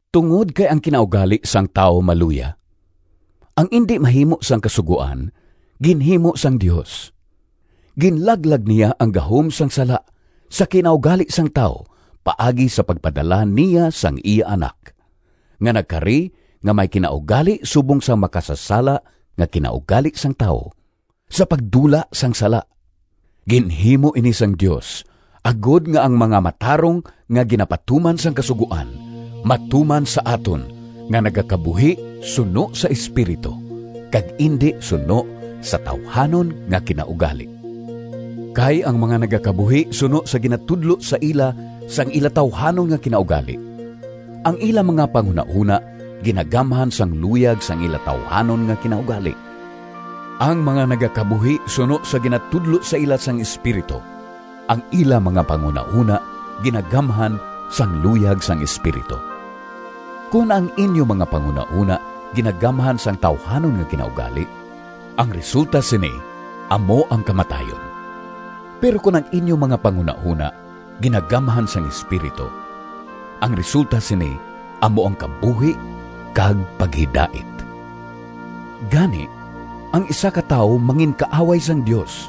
Tungod kay ang kinaugali sang tawo maluya, ang indi mahimo sang Kasugoan, ginhimo sang Dios. Ginlaglag niya ang gahom sang sala sa kinaugali sang tawo paagi sa pagpadala niya sang iya Anak, nga nagkari nga may kinaugali subong sang makasasala nga kinaugali sang tawo, sa pagdula sang sala. Ginhimo ini sang Dios, agod nga ang mga matarong nga ginapatuman sang Kasugoan matuman sa aton nga nagakabuhi suno sa Espiritu, kag indi suno sa tawuhanon nga kinaugali. Kay ang mga nagakabuhi suno sa ginatudlo sa ila sang ila tawuhanon nga kinaugali, ang ila mga panghunahona ginagamhan sang luyag sang ila tawuhanon nga kinaugali. Ang mga nagakabuhi suno sa ginatudlo sa ila sang Espiritu, ang ila mga panghunahona ginagamhan sang luyag sang Espiritu. Kon ang inyo mga panghunahona ginagamhan sang tawuhanon nga kinaugali, ang resulta sini amo ang kamatayon. Pero kon ang inyo mga panghunahona ginagamhan sang Espiritu, ang resulta sini amo ang kabuhi kag paghidait. Gani, ang isa ka tawo manginkaaway sang Dios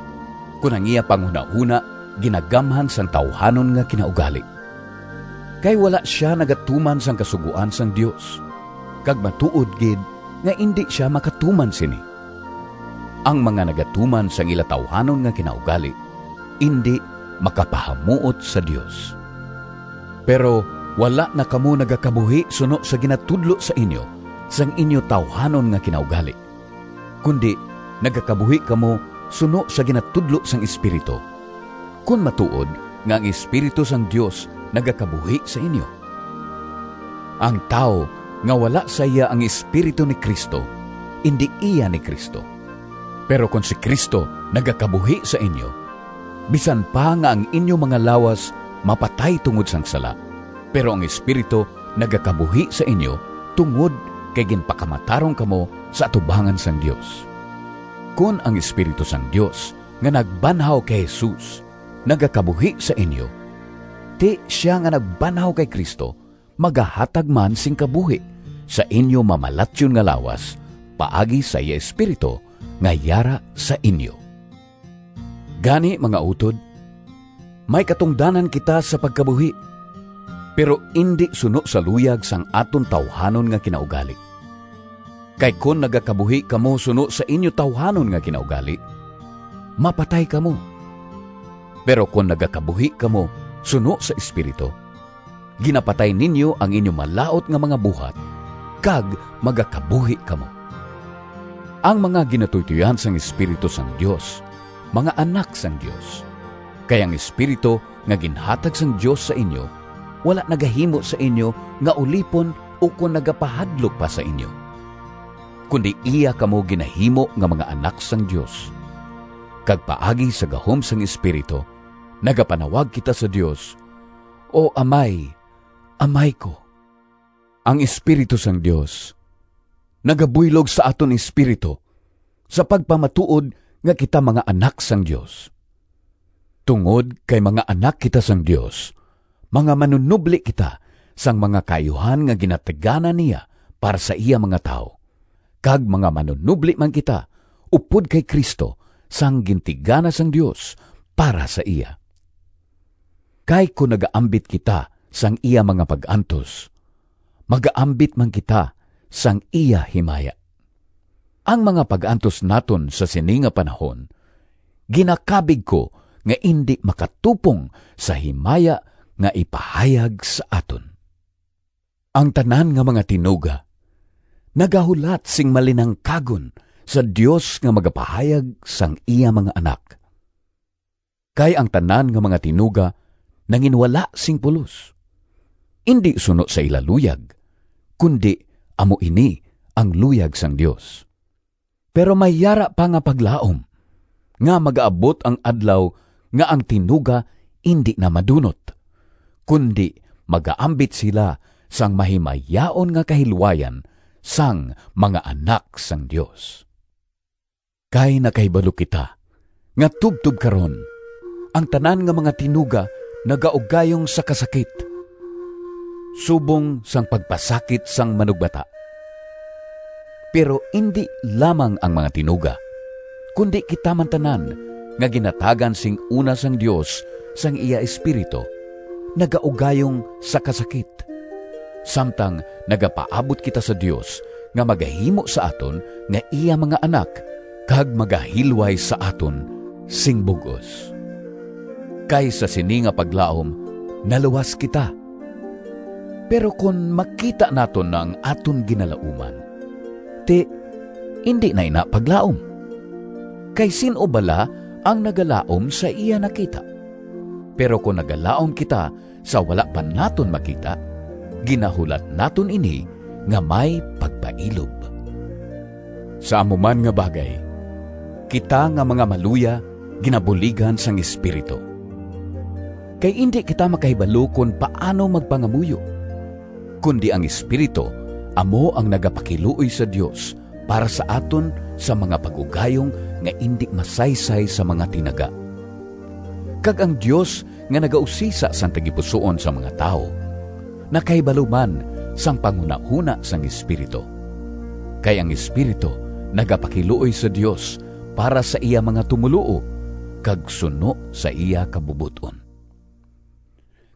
kon ang iya panghunahona ginagamhan sang tawuhanon nga kinaugali, kay wala sia nagatuman sang kasugoan sang Dios, kag matuod gid nga indi sia makatuman sini. Ang mga nagatuman sang ila tawuhanon nga kinaugali indi makapahamuot sa Dios. Pero wala na kamo nagakabuhi suno sa ginatudlo sa inyo sang inyo tawuhanon nga kinaugali, kundi nagakabuhi kamo suno sa ginatudlo sang Espiritu, kon matuod nga ang Espiritu sang Dios nagakabuhi sa inyo. Ang tawo nga wala sa iya ang Espiritu ni Cristo indi iya ni Cristo. Pero kon si Cristo nagakabuhi sa inyo, bisan pa nga ang inyo mga lawas mapatay tungod sang sala, pero ang Espiritu nagakabuhi sa inyo tungod kay ginpakamatarong kamo sa atubangan sang Dios. Kon ang Espiritu sang Dios nga nagbanhaw kay Jesus nagakabuhi sa inyo, ti sia nga nagbanhaw kay Cristo magahatag man sing kabuhi sa inyo mamalatyon nga lawas, paagi sa iya Espiritu nga yara sa inyo. Gani, mga utod, may katungdanan kita sa pagkabuhi, pero indi suno sa luyag sang aton tawuhanon nga kinaugali. Kay kon nagakabuhi kamo suno sa inyo tawuhanon nga kinaugali, mapatay kamo. Pero kon nagakabuhi kamo suno sa Espiritu, ginapatay ninyo ang inyo malaut nga mga buhat, kag magakabuhi kamo. Ang mga ginatuytoyan sang Espiritu sang Dios mga anak sang Dios. Kay ang Espiritu nga ginhatag sang Dios sa inyo wala nagahimo sa inyo nga ulipon ukon nagapahadlok pa sa inyo, kundi iya kamo ginahimo nga mga anak sang Dios, kag paagi sa gahom sang Espiritu nagapanawag kita sa Dios, “O Amay, Amay ko!” Ang Espiritu sang Dios nagabuylog sa aton espiritu sa pagpamatuod nga kita mga anak sang Dios. Tungod kay mga anak kita sang Dios, mga manunobli kita sang mga kaayuhan nga ginatigana niya para sa iya mga tawo, kag mga manunobli man kita upod kay Cristo sang gintigana sang Dios para sa iya. Kay kon nagaambit kita sang iya mga pag-antos, magaambit man kita sang iya himaya. Ang mga pag-antos naton sa sini nga panahon ginakabig ko nga indi makatupong sa himaya nga ipahayag sa aton. Ang tanan nga mga tinuga nagahulat sing malinangkagon sa Dios nga magapahayag sang iya mga anak. Kay ang tanan nga mga tinuga nanginwala sing pulos, indi suno sa ila luyag, kundi amo ini ang luyag sang Dios. Pero may yara pa nga paglaom, nga magaabot ang adlaw nga ang tinuga indi na madunot, kundi magaambit sila sang mahimayaon nga kahilwayan sang mga anak sang Dios. Kay nakahibalo kita nga tubtob karon, ang tanan nga mga tinuga nagaugayong sa kasakit, subong sang pagpasakit sang manugbata. Pero indi lamang ang mga tinuga, kundi kita man tanan nga ginhatagan sing una sang Dios sang iya Espiritu, nagaugayong sa kasakit, samtang nagapaabot kita sa Dios nga magahimo sa aton nga iya mga anak kag magahilway sa aton sing bug-os. Kay sa sini nga paglaom naluwas kita. Pero kon makita naton ang aton ginalauman, ti indi na ina paglaom. Kay sin-o bala ang nagalaom sa iya nakita? Pero kon nagalaom kita sa wala pa naton makita, ginahulat naton ini nga may pagpailob. Sa amo man nga bagay, kita nga mga maluya ginabuligan sang Espiritu. Kay indi kita makahibalo kon paano magpangamuyo, kundi ang Espiritu amo ang nagapakiluoy sa Dios para sa aton sa mga pag-ugayong nga indi masaysay sa mga tinaga. Kag ang Dios nga nagausisa sang tagipusoon sang mga tawo nakahibalo man sang panghunahona sang Espiritu. Kay ang Espiritu nagapakiluoy sa Dios para sa iya mga tumoluo kag suno sa iya kabubot-on.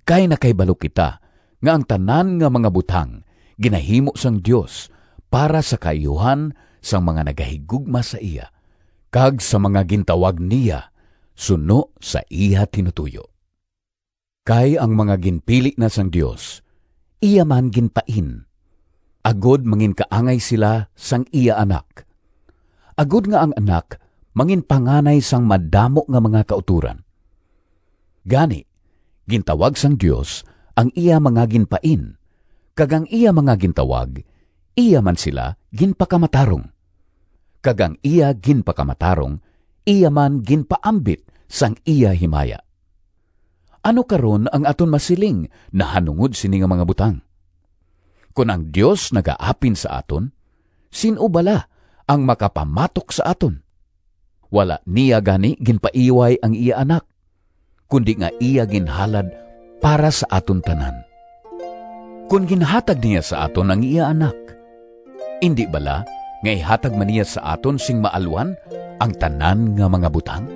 Kay nakahibalo kita nga ang tanan nga mga butang ginahimo sang Dios para sa kaayuhan sang mga nagahigugma sa iya, kag sa mga gintawag niya suno sa iya tinutoyo. Kay ang mga ginpili na sang Dios, iya man ginpain, agod manginkaangay sila sang iya Anak, agod nga ang Anak manginpanganay sang madamo nga mga kautoran. Gani, gintawag sang Dios ang iya mga ginpain; kag ang iya mga gintawag, iya man sila ginpakamatarong; kag ang iya ginpakamatarong iya man ginpaambit sang iya himaya. Ano karon ang aton masiling nahanungod sini nga mga butang? Kon ang Dios nagaapin sa aton, sin-o bala ang makapamatok sa aton? Wala niya gani ginpaiway ang iya Anak, kundi nga iya ginhalad para sa aton tanan! Kon ginhatag niya sa aton ang iya Anak, indi bala nga ihatag man niya sa aton sing maalwan ang tanan nga mga butang?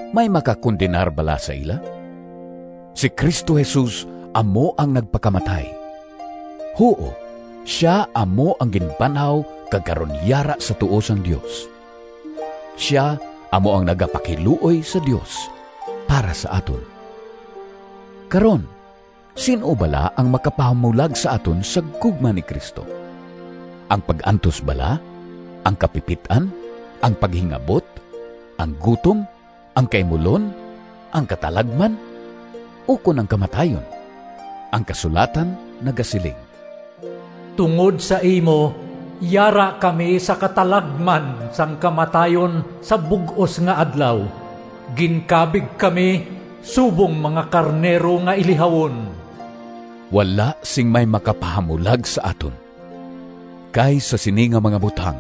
May makakondenar bala sa ila? Si Cristo Jesus amo ang nagpakamatay, huo, sia amo ang ginbanhaw kag karon yara sa tuo sang Dios. Sia amo ang nagapakiluoy sa Dios para sa aton! Karon, sin-o bala ang makapahamulag sa aton sa gugma ni Cristo? Ang pag-antos bala, ang kapipit-an, ang paghingabot, ang gutom, ang kaimulon, ang katalagman, ukon ang kamatayon? Ang kasulatan nagasiling: “Tungod sa imo Yara kami sa katalagman Sang kamatayon sa bug-os nga adlaw, Ginkabig kami Subong mga karnero nga ilihawon.” Wala sing may makapahamulag sa aton! Kay sa sini nga mga butang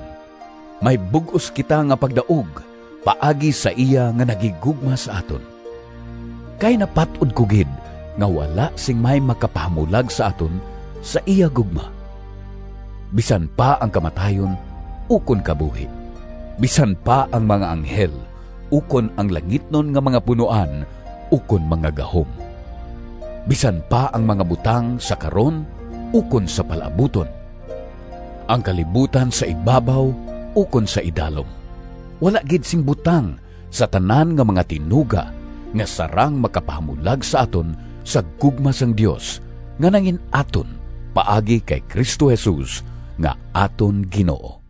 may bug-os kita nga pagdaog paagi sa iya nga naghigugma sa aton! Kay napat-od ko gid nga wala sing may makapahamulag sa aton sa iya gugma, bisan pa ang kamatayon ukon kabuhi, bisan pa ang mga anghel ukon ang langitnon nga mga punoan ukon mga gahom. Bisan pa ang mga butang sa karon ukon sa palaabuton, ang kalibutan sa ibabaw ukon sa idalom, wala gid sing butang sa tanan nga mga tinuga nga sarang makapahamulag sa aton sa gugma sang Dios nga nangin-aton paagi kay Cristo Jesus nga aton Ginoo.